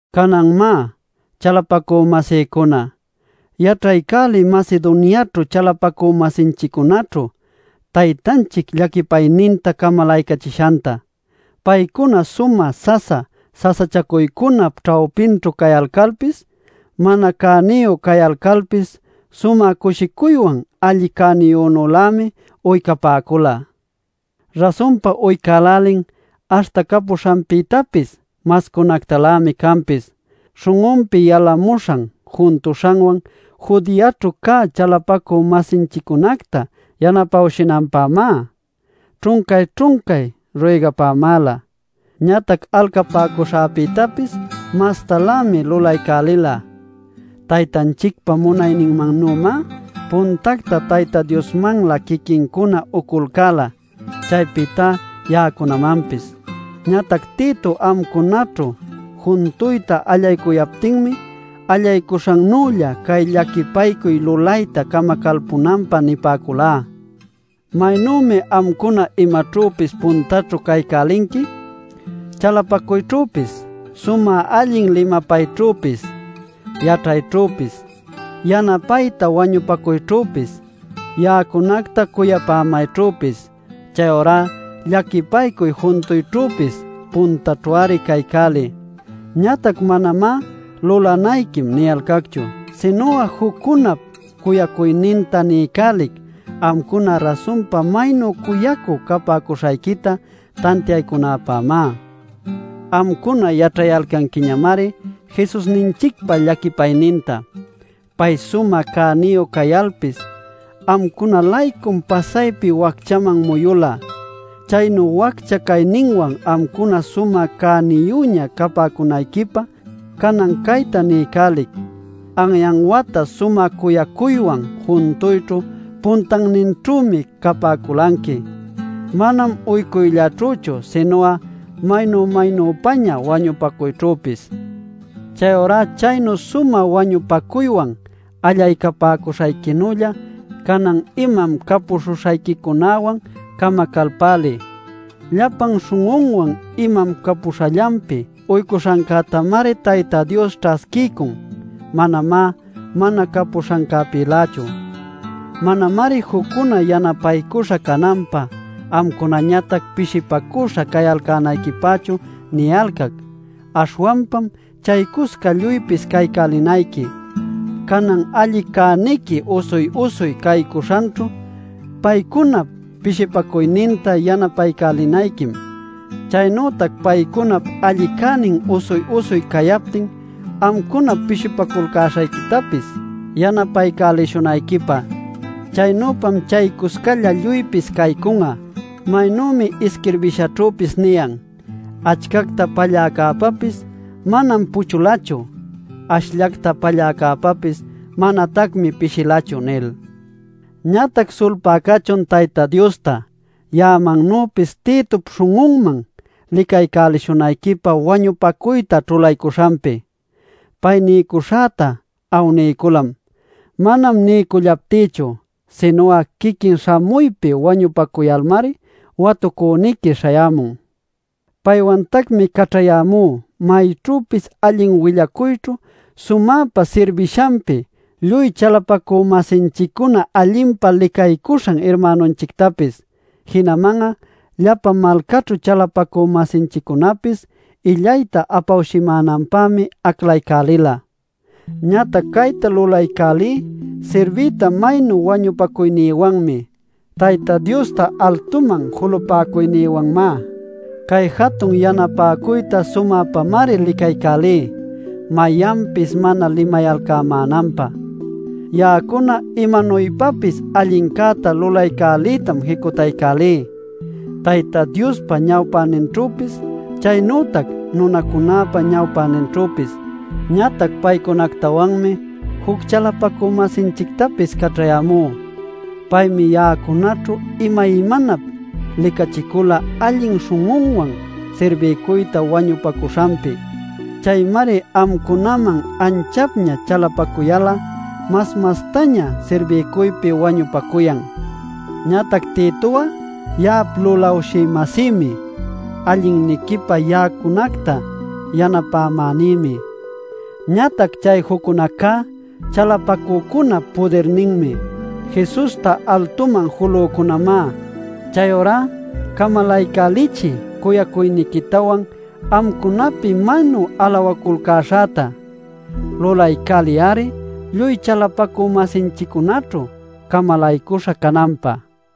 Canan má, chalapacü-masïcuna, yaćhaycäliy Macedoniaćhu chalapacü-masinchiccunaćhu Taytanchic llaquipayninta camalaycachishanta. Paycuna sumä sasa sasachacuycunap ćhawpinćhu cayalcalpis, mana cäniyu cayalcalpis sumä cushicuywan alli cäniyünülämi uycapäcula. Rasunpa uycälälin, aśhta capuśhanpïtapis mascunactalämi canpis. Śhun'unpi yalamuśhan juntuśhanwan Judeaćhu cä chalapacü-masinchiccunacta yanapawshïnanpämá ćhuncay-ćhuncay ruygapämäla. Ñatac alcapäcuśhäpïtapis mastalämi lulaycälila; Taytanchicpa munayninmannümá puntacta Tayta Diosmanlä quiquincuna uculcäla, chaypïta ya'acunamanpis. Ñatac Tito amcunaćhu juntuyta allaycuyaptinmi, allaycuśhannülla cay llaquipaycuy lulayta camacalpunanpä nipäculá. Maynümi amcuna imaćhüpis puntaćhu caycälinqui: chalapacuyćhüpis, sumä allin limapayćhüpis, yaćhayćhüpis, yanapayta wañupacuyćhüpis, ya'acunacta cuyapämayćhüpis. Chayurá llaquipaycuy juntuyćhüpis puntaćhu-ari caycäliy. Ñatac manamá “lulanayquim” niyalcacchu. Sinu'a juccunap cuyacuyninta niycälic amcuna rasunpa maynu cuyacü capäcuśhayquita tantiaycunäpämá. Amcuna yaćhayalcanquiñamari Jesusninchicpa llaquipayninta: pay sumä cäniyu cayalpis amcuna-laycum pasaypi wacchaman muyula chaynu waccha cayninwan amcuna sumä cäniyüña capäcunayquipä. Canan cayta niycälic: Anyan wata sumä cuyacuywan juntuyćhu puntanninćhümi capäculanqui; manam uycuyllaćhüchu sinu'a maynu maynüpaña wañupacuyćhüpis. Chayurá chaynu sumä wañupacuywan allaycapäcuśhayquinülla canan imam capuśhuśhayquicunäwan camacalpäliy. Llapan śhun'unwan imam capuśhallanpi uycuśhancätamari Tayta Dios ćhasquiycun; manamá mana capuśhancäpïlächu. Manamari juccuna yanapaycuśha cananpä amcunañatac pishipacüśha cayalcänayquipächu niyalcac, aśhwanpam chaycusca lluypis caycälinayqui. Canan alli cäniqui usuy-usuy caycuśhanćhu paycunap pishipaycuyninta yanapaycälinayquim chaynütac paycunap alli cänin usuy-usuy cayaptin amcunap pishipaculcäśhayquitapis yanapaycälishunayquipä. Chaynüpam chaycuscalla lluypis caycun'a. Maynümi isquirbishaćhüpis niyan: “Achcacta palläcäpäpis manam puchulachu; ashllacta palläcäpäpis manatacmi pishilachu” nil. Ñatac sulpay cachun Tayta Diosta, ya'amannüpis Titop śhun'unman licaycälishunayquipä wañupacuyta ćhulaycuśhanpi. Pay niycuśhäta awniyculam. Manam niycullaptïchu, sinu'a quiquin śhamuypi wañupacuyalmari watucüniqui śhayämun. Paywantacmi caćhayämú mayćhüpis allin willacuyćhu sumäpa sirbishanpi lluy chalapacü-masinchiccuna allinpa licapäcuśhan irmänunchictapis. Jinaman'a llapa malcaćhu chalapacü-masinchiccunapis illayta apawshïmänanpämi aclaycälila. Ñatac cayta lulaycälí sirbiyta maynu wañupacuynïwanmi, Tayta Diosta altuman julapäcuynïwanmá. Cay jatun yanapäcuyta sumäpamari licaycälí mayanpis mana limayalcämänanpä. Ya'acuna imanuypapis allincäta lulaycäliytam jicutaycälí Tayta Diospa ñawpäninćhüpis, chaynütac nunacunäpa ñawpäninćhüpis. Ñatac paycunactawanmi juc chalapacü-masinchictapis caćhayämú. Paymi ya'acunaćhu imaymanap licachicula allin śhun'uwan sirbiycuyta wañupacuśhanpi. Chaymari amcunaman anchapña chalapacuyal'a mas mastaña sirbiycuypi wañupacuyan. Ñatac Tito'a ya'ap lulawshï-masïmi, allinniquipä ya'acunacta yanapämänïmi. Ñatac chay juccunacá chalapacücunap pudirninmi, Jesusta altuman julücunamá. Chayurá camalaycälichiy cuyacuyniquitawan amcunapi maynu alawaculcäśhäta. Lulaycäliy-ari lluy chalapacü-masinchiccunaćhu camalaycuśha cananpä.